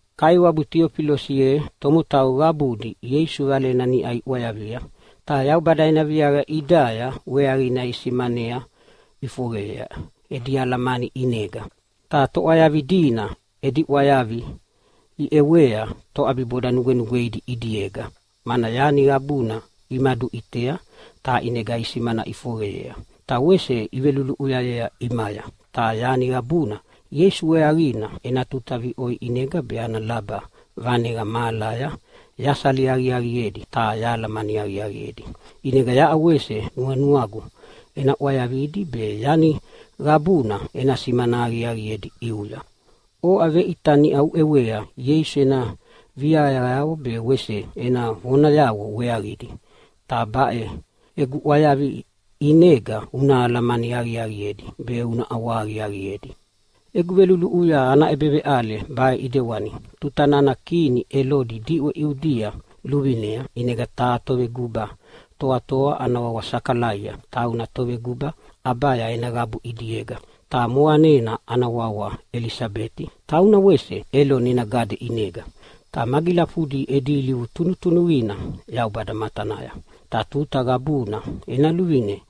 Kaiwabu Tiofilasi ye, tomotau qabudi Ieisu Valena niʼau iʼwayavia, ta Yaubada ena viaqa ʼidaya weaqina isimana ʼifoqeyea edi alamani ʼinega. Ta toʼwayavi dina edi ʼwayavi iʼewea toʼabiboda nugwenugweidi ʼidiega, mana yani qabuna imaduʼitea ta ʼinega isimana ʼifoqeyea ta wese iveluluʼuyayea ʼimaya. Ta yani qabuna Ieisu weaqina ena tuta viʼoi ʼinega be ana laba vaneqa mahalaya yasali aqiaqiedi ta yahalamani aqiaqiedi. ʼInega yaʼa wese nuanuagu ena ʼwayavidi be yani qabuna ena simana aqiaqiedi ʼiuya. Oʼa veʼita niʼa uʼewea Ieisu ena viaqayavo be wese ena vonayavo weaqidi, ta baʼe egu ʼwayavi ʼinega una alamani aqiaqiedi be una ʼawahaqiaqiedi. Egu veluluʼuya ana ʼebeveʼale baʼe ʼidewana: Tuta nana kini Elodi diʼwe Iudia luvinea, ʼinega taha toveguba toatoa ana wawa Sakalaia, tauna toveguba Abaya ena qabu ʼidiega. Ta moqanena ana wawa Elisabeti, tauna wese Eloni ena gade ʼinega. Ta magilafudi edi ilivu tunutunuqina Yaubada matanaya, ta tuta qabuna ena luvine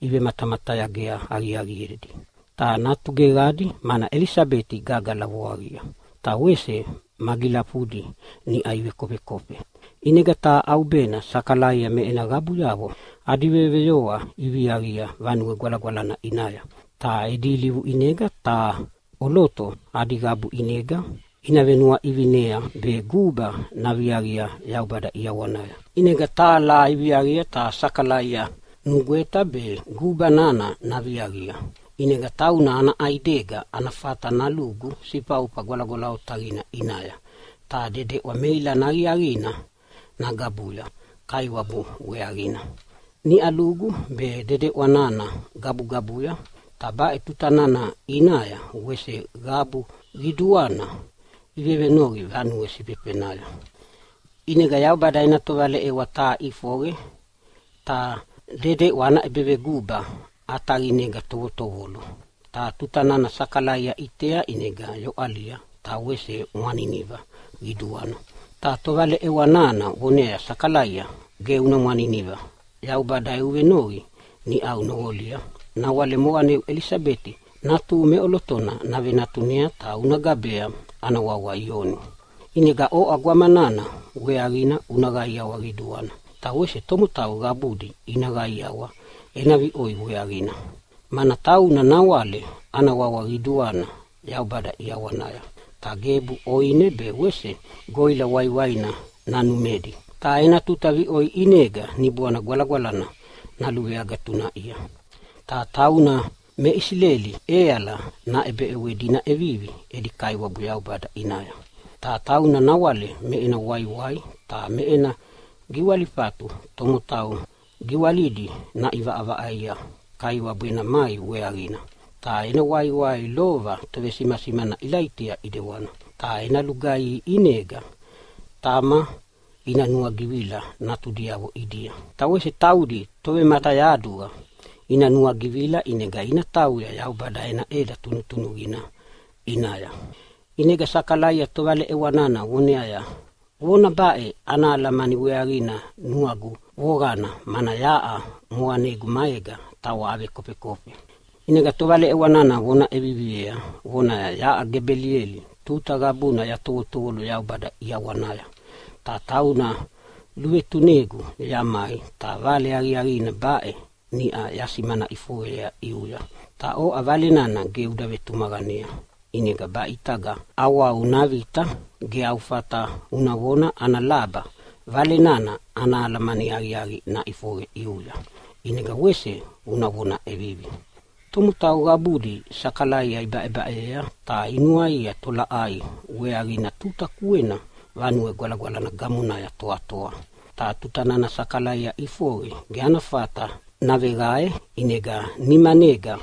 ivematamatayaga aqiaqiedi. Ta natu geqadi, mana Elisabeti gagala voaqia, ta wese magilafudi niʼau ivekofekofe. ʼInega taha ʼaubena Sakalaia me ena qabuyavo adi veyoveyoa iviaqia Vanue Gwalagwalana ʼinaya. Ta edi ilivu ʼinega taha ʼoloto adi qabu ʼinega ina venuaʼivinea be guba naviaqia Yaubada ʼiawanaya. ʼInega taha laha iviaqia ta Sakalaia nugweta be guba nana naviaqia. ʼInega tauna ana ʼaidega ana fata nalugu Sifaufa Gwalagwala Otaqina ʼinaya ta dedeʼwa meilana aqiaqina nagabuya Kaiwabu weaqina. Niʼa lugu be dedeʼwa nana gabugabuya, ta baʼe tuta nana ʼinaya wese qabu qiduana ivevenoqi vanue sifefenaya. ʼInega Yaubada ena tovaleʼewa taha ʼifoqe ta dedeʼwa ana ʼebeveguba ʼataqinega tovotovolo. Ta tuta nana Sakalaia ʼitea ʼinega yoʼalia ta wese mwaniniva qiduana. Ta tovaleʼewa nana voneaya, “Sakalaia, ge una mwaniniva. Yaubada eu venoqi niʼau noqolia. Nawale moqaneu Elisabeti natuhu meʼolotona navenatunea, ta una gabea ana wawa Ioni. “ʼInega oʼa gwama nana weaqina una qaiawa qiduana, ta wese tomotau qabudi ina qaiawa ena viʼoi weaqina, mana tauna nawale ana wawa qiduana Yaubada ʼiawanaya. Ta gebu ʼoine be wese goʼila waiwaina nanumedi, ta ena tuta viʼoi ʼinega Niboana Gwalagwalana naluveagatunaʼia. Ta tauna me Isileli ʼeala naʼebeʼewedi ina ʼevivi edi Kaiwabu Yaubada ʼinaya. Ta tauna nawale me ena waiwai ta me ena giwalifatu tomotau giwalidi naʼivaʼavaʼaia Kaiwabu ena mai weaqina. Ta ena waiwai lova tovesimasimana Ilaitia ʼidewana. Ta ena lugaihi ʼinega tama ina nuagivila natudiavo ʼidia. Ta wese taudi tovematayaduqa ina nuagivila, ʼinega ina tauya Yaubada ena ʼeda tunutunuqina ʼinaya.” ʼInega Sakalaia tovaleʼewana voneaya, “Vona baʼe ana alamani weaqina nuagu voqana, mana yaʼa moqanegu maega tawa avekofekofe.” ʼInega tovaleʼewa nana vona ʼeviviea vonaya, “Yaʼa Gebeliela, tuta qabuna yatovotovolo Yaubada ʼiawanaya, ta tauna luvetunegu yamai ta vale aqiaqina baʼe niʼau yasimana ʼifoqeyea ʼiuya. Ta oʼa vale nana ge uda vetumaqanei, ʼinega baʼe ʼitaga ʼawau navita ge au fata una vona ana laba vale nana ana alamani aqiaqi naʼifoqe ʼiuya, ʼinega wese una vona ʼevivi.” Tomotau qabudi Sakalaia ibaʼebaʼeyea ta inuanua tolaʼai weaqina tuta kuena Vanue Gwalagwalana gamonaya toatoa. Ta tuta nana Sakalaia ʼifoqe ge ana fata naveqae, ʼinega nimanega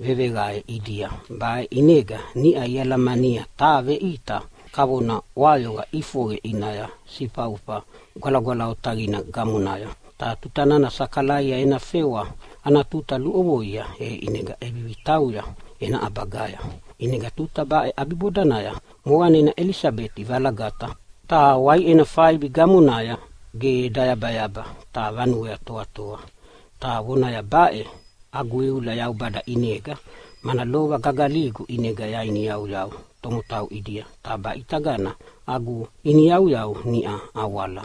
veveqae ʼidia. Baʼe ʼinega niʼa ialamania taha veʼita kavona ʼwayoqa ʼifoqe ʼinaya Sifaufa Gwalagwala Otaqina gamonaya. Ta tuta nana Sakalaia ena fewa ana tuta luʼovoa, e ʼinega ʼevivi tauya ena ʼabagaya. ʼInega tuta baʼe ʼabibodanaya moqanena Elisabeti valagata, ta waiʼena faibi gamonaya ge dayabayaba ta vanuea toatoa. Ta vonaya, “Baʼe agu iula Yaubada ʼinega, mana lova gagaligu ʼinega yainiyauyau tomotau ʼidia, ta baʼe ʼitagana agu iniyauyau niʼa awala.”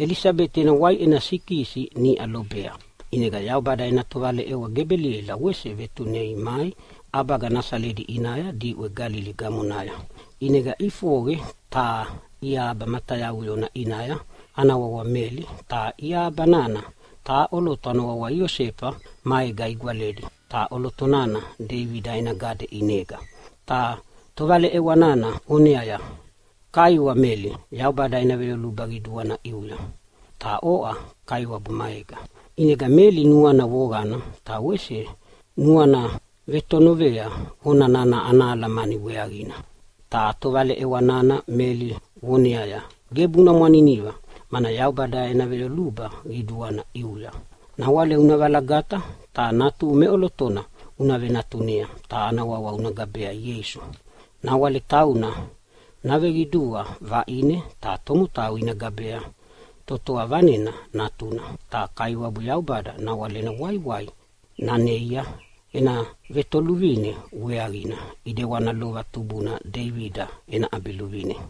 Elisabeti ena waiʼena vesikisina niʼa lobea, ʼinega Yaubada ena tovaleʼewa Gebeliela wese vetunei mai ʼabaga Nasaleta ʼinaya diʼwe Galili gamonaya. ʼInega ʼifoqe taha iahaba matayauyona ʼinaya ana wawa Meli. Ta iahaba nana taha ʼoloto ana wawa Iosefa maega igwaledi, ta ʼoloto nana Deibida ena gade ʼinega. Ta tovaleʼewa nana voneaya, “Kaiwa Meli, Yaubada ena veyoluba qiduana ʼiuya. Ta oʼa Kaiwabu maega.” ʼInega Meli nuana voqana ta wese nuana vetonovea vona nana ana alamani weaqina. Ta tovaleʼewa nana Meli voneaya, “Gebu una mwaniniva, mana Yaubada ena veyoluba qiduana ʼiuya. Nawale una valagata ta natuhu meʼolotona una venatunea ta ana wawa una gabea Ieisu. Nawale tauna naveqidua vaʼine ta tomotau ina gabea Toatoa Vanena Natuna. Ta Kaiwabu Yaubada nawale ena waiwai naneia ena vetoluvine weaqina ʼidewana lova tubuna Deibida ʼabiluvine.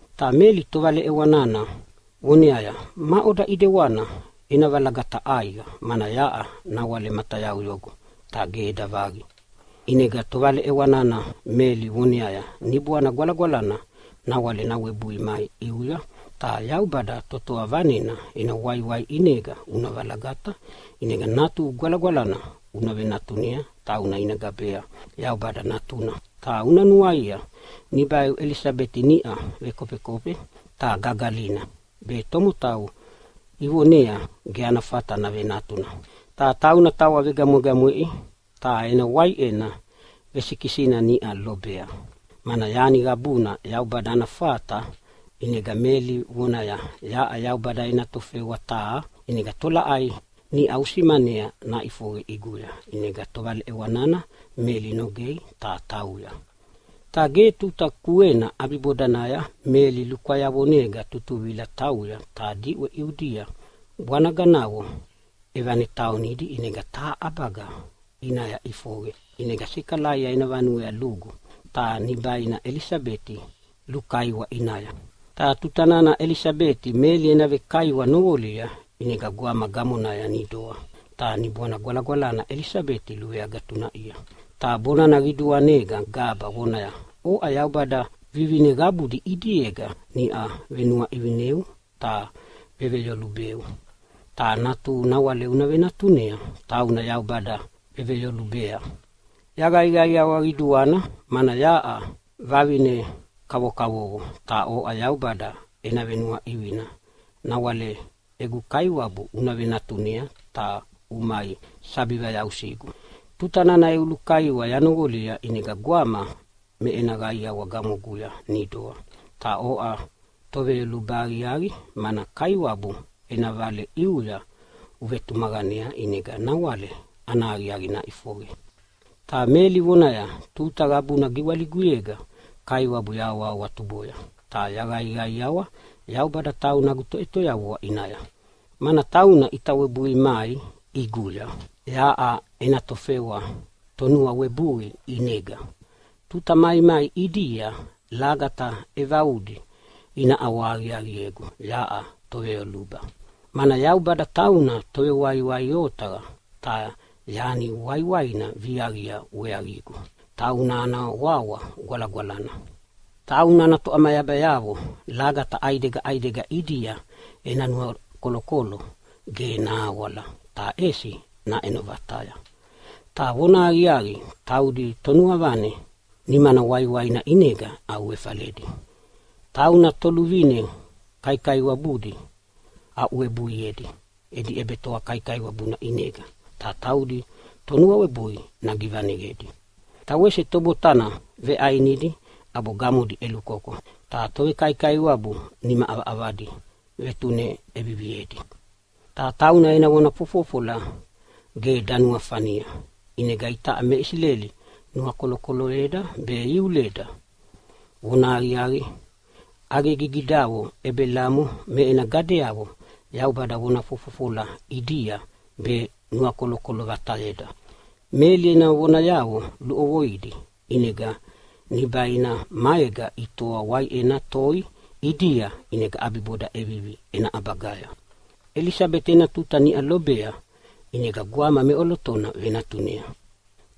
Ta Meli tovaleʼewa nana voneaya, “Maʼoda ʼedewana ena valagata ʼaiqa, mana yaʼa nawale matayauyogu ta ge eda vaqi?” ʼInega tovaleʼewa nana Meli voneaya, “Niboana Gwalagwalana nawale nawebui mai ʼiuya ta Yaubada Toatoa Vanena ena waiwai ʼinega una valagata. ʼInega natuhu gwalagwalana una venatunea, tauna ina gabea Yaubada Natuna. Ta una nuaia nibaiu Elisabeti niʼa vekofekofe ta gagalina be tomotau ivonea ge ana fata navenatuna. Ta tauna tawa vegamwegamweʼi ta ena waiʼena vesikisina niʼa lobea. Mana yani qabuna Yaubada ana fata!” ʼInega Meli voneaya, “Yaʼa Yaubada ena tofewa taha, ʼinega tolaʼai niʼau usimanea naʼifoqe ʼiguya.” ʼInega tovaleʼewa nana Meli nogei ta tauya. Ta ge tuta kuena ʼabibodanaya Meli lukwayavonega tutuvila tauya ta diʼwe Iudia bwanaganavo ʼevataonidi, ʼinega taha ʼabaga ʼinaya ʼifoqe. ʼInega Sakalaia ena vanuea lugu ta nibaina Elisabeti lukaiwa ʼinaya. Ta tutana Elisabeti Meli ena vekaiwa noqolia ʼinega gwama gamonaya nidoa ta Niboana Gwalagwalana Elisabeti luveagatunaʼia. Ta bonana qiduanega gaba vonaya, “Oʼa Yaubada vivine qabudi ʼidiega niʼau venuaʼivineu ta veveyolubeu, ta natuhu nawale una venatunea tauna Yaubada veveyolubea. Yaqaiqaiawa qiduana mana yaʼa vavine kavokavovo ta oʼa Yaubada ena venuaʼivina nawale egu kaiwabu una venatunea, ta umai sabi vayausigu! Tuta nana eu lukaiwa yanoqolia, ʼinega gwama me ena qaiawa gamoguya nidoa. Ta oʼa toveyoluba aqiaqi, mana Kaiwabu ena vale ʼiuya uvetumaqanea ʼinega nawale ana aqiaqi naʼifoqe.” Ta Meli vonaya, “Tuta qabuna giwaliguyega Kaiwabu yahawahawatuboya, ta yaqaiqaiawa Yaubada tauna agu Toʼetoyavua ʼinaya. Mana tauna ʼita webui mai ʼiguya yaʼa ena tofewa tonuawebui. ʼInega tuta maimai ʼidia lagata ʼevaudi ina ʼawahaqiaqiegu yaʼa toveyoluba, mana Yaubada tauna Tovewaiwai otaqa ta yani waiwaina viaqia weaqigu. Tauna ana wawa gwalagwalana. Tauna ana toʼamayabayavo lagata ʼaidega ʼaidega ʼidia ena nuakolokolo ge nahawala ta ʼesi naʼeno vataya. Ta vonahaqiaqi, taudi tonuavane nimana waiwaina ʼinega ʼauefaledi. Tauna toluvine kaikaiwabudi aʼuwebuiedi edi ʼebetoa kaikaiwabuna ʼinega, ta taudi tonuawebui givaneyedi. Ta wese tobotana veʼainidi ʼabo gamodi ʼelukoko, ta tovekaikaiwabu nima ʼavaʼavadi vetune ʼeviviedi. Ta tauna ena vona fofofola ge danuafania, ʼinega itaʼa me Isileli nuakolokoloyeda be iuleda. Vonahaqiaqi, ʼaqegigidavo Ebelamo me ena gadeavo Yaubada vona fofofola ʼidia be nanuakolokolo vatayeda.” Meli ena vonayavo luʼovoidi, ʼinega nibaina maega itoa waiʼena toi ʼidia, ʼinega ʼabiboda ʼevivi ena ʼabagaya. Elisabeti ena tuta niʼa lobea ʼinega gwama meʼolotona venatunea.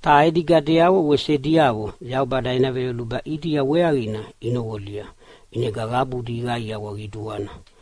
Ta edi gadeavo wese ediavo Yaubada ena veyoluba ʼidia weaqina inoqolia ʼinega qabudi iqaiawa qiduana.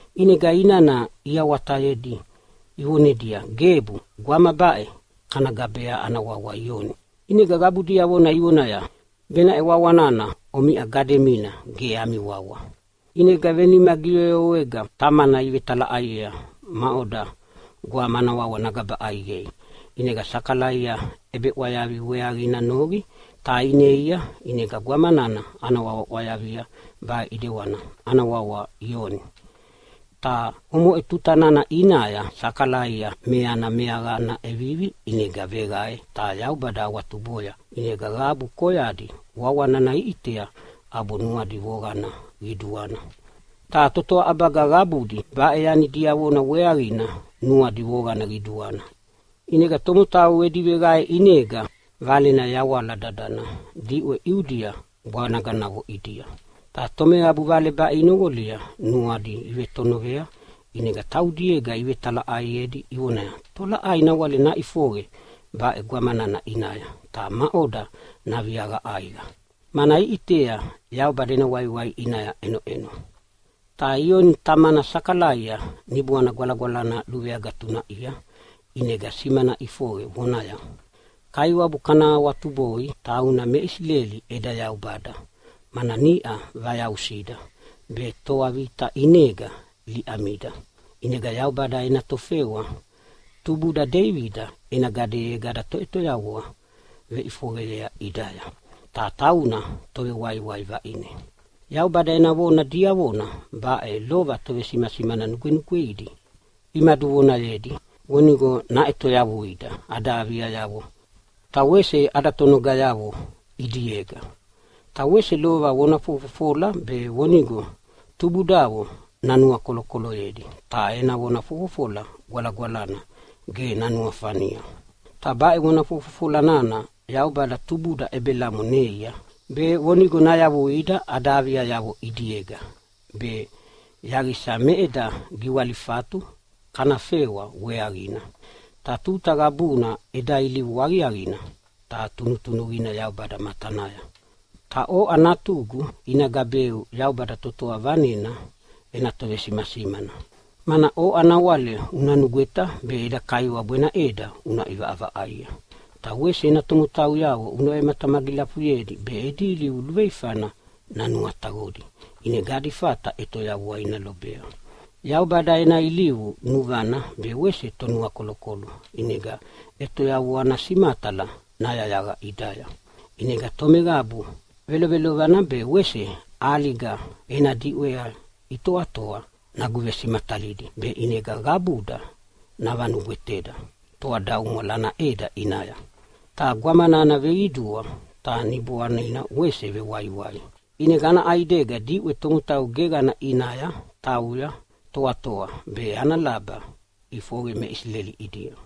ʼInega inana iawatayedi ivonedia, “Gebu, gwama baʼe kana gabea ana wawa Ioni.” ʼInega qabu diavona ivonaya, “Benaʼe wawa nana omiʼa gademina ge ami wawa.” ʼInega venima giyoyowega tamana ivetalaʼaiea maʼoda gwama ana wawa nagaba ʼaiqei. ʼInega Sakalaia ʼebeʼwayavi weaqina noqi ta ineia, ʼinega gwama nana ana wawa ʼwayavia baʼe ʼidewana, “Ana wawa Ioni.” Ta omoʼe tuta nana ʼinaya Sakalaia meana meaqana ʼevivi, ʼinega veqae ta Yaubada awatuboya. ʼInega qabu koyadi wawa nana iʼitea ʼabo nuadi voqana qiduana. Ta totoa ʼabaga qabudi baʼe yani diavona weaqina nuadi voqana qiduana. ʼInega tomotau edi veqae ʼinega valena yawala dadana diʼwe Iudia bwanaganavo ʼidia. Ta tomeqabu vale baʼe inoqolia nuadi ivetonovea, ʼinega taudiega ivetalaʼaiedi ivonaya, “Tolaʼai nawale naʼifoqe baʼe gwama nana ʼinaya ta maʼoda naviaqa ʼaiqa?” Mana iʼitea Yaubada ena waiwai ʼinaya ʼenoʼeno. Ta Ioni tamana Sakalaia Niboana Gwalagwalana luveagatunaʼia ʼinega simana ʼifoqe vonaya, “Kaiwabu kana awatuboi, tauna me Isileli eda Yaubada, mana niʼau vayausida be toa vita ʼinega liʼamida. ʼInega Yaubada ena tofewa tubuda Deibida ena gadeyega ada Toʼetoyavua veʼifoqeyea ʼidaya, ta tauna Tovewaiwai vaʼine. Yaubada ena vona diavona baʼe lova tovesimasimana nugwenugweidi imaduvonayedi, vonigo naʼetoyavuida ada aviayavo ta wese ada tonogayavo ʼidiega. Ta wese lova vona fofofola be vonigo tubudavo nanuakolokoloyedi ta ena vona fofofola gwalagwalana ge nanuafania. Ta baʼe vona fofofola nana Yaubada tubuda Ebelamo neia, be vonigo nayavuida ada aviayavo ʼidiega be yaqisa me eda giwalifatu kana fewa weaqina. Ta tuta qabuna eda ilivu aqiaqina ta tunutunuqina Yaubada matanaya. Ta oʼa natugu, ina gabeu Yaubada Toatoa Vanena ena tovesimasimana, mana oʼa nawale una nugweta be eda Kaiwabu ena ʼeda una ʼivaʼavaʼaia. Ta wese ena tomotauyavo una vematamagilafuyedi be edi ilivu luveifana nanuataqodi, ʼinega adi fata ʼetoyavua ina lobea. Yaubada ena ilivu nuvana be wese Tonuakolokolo, ʼinega ʼetoyavua ana simatala nayayaqa ʼidaya. ʼInega tomeqabu velovelovana be wese ʼaliga ena diʼwea itoatoa naguvesimatalidi, be ʼinega qabuda navanugweteda toadaumwala ana ʼeda ʼinaya.” Ta gwama nana veqidua ta niboanina wese vewaiwai. ʼInega ana ʼaidega diʼwe tomotau geqana ʼinaya tauya toatoa be ana laba ʼifoqe me Isileli ʼidia.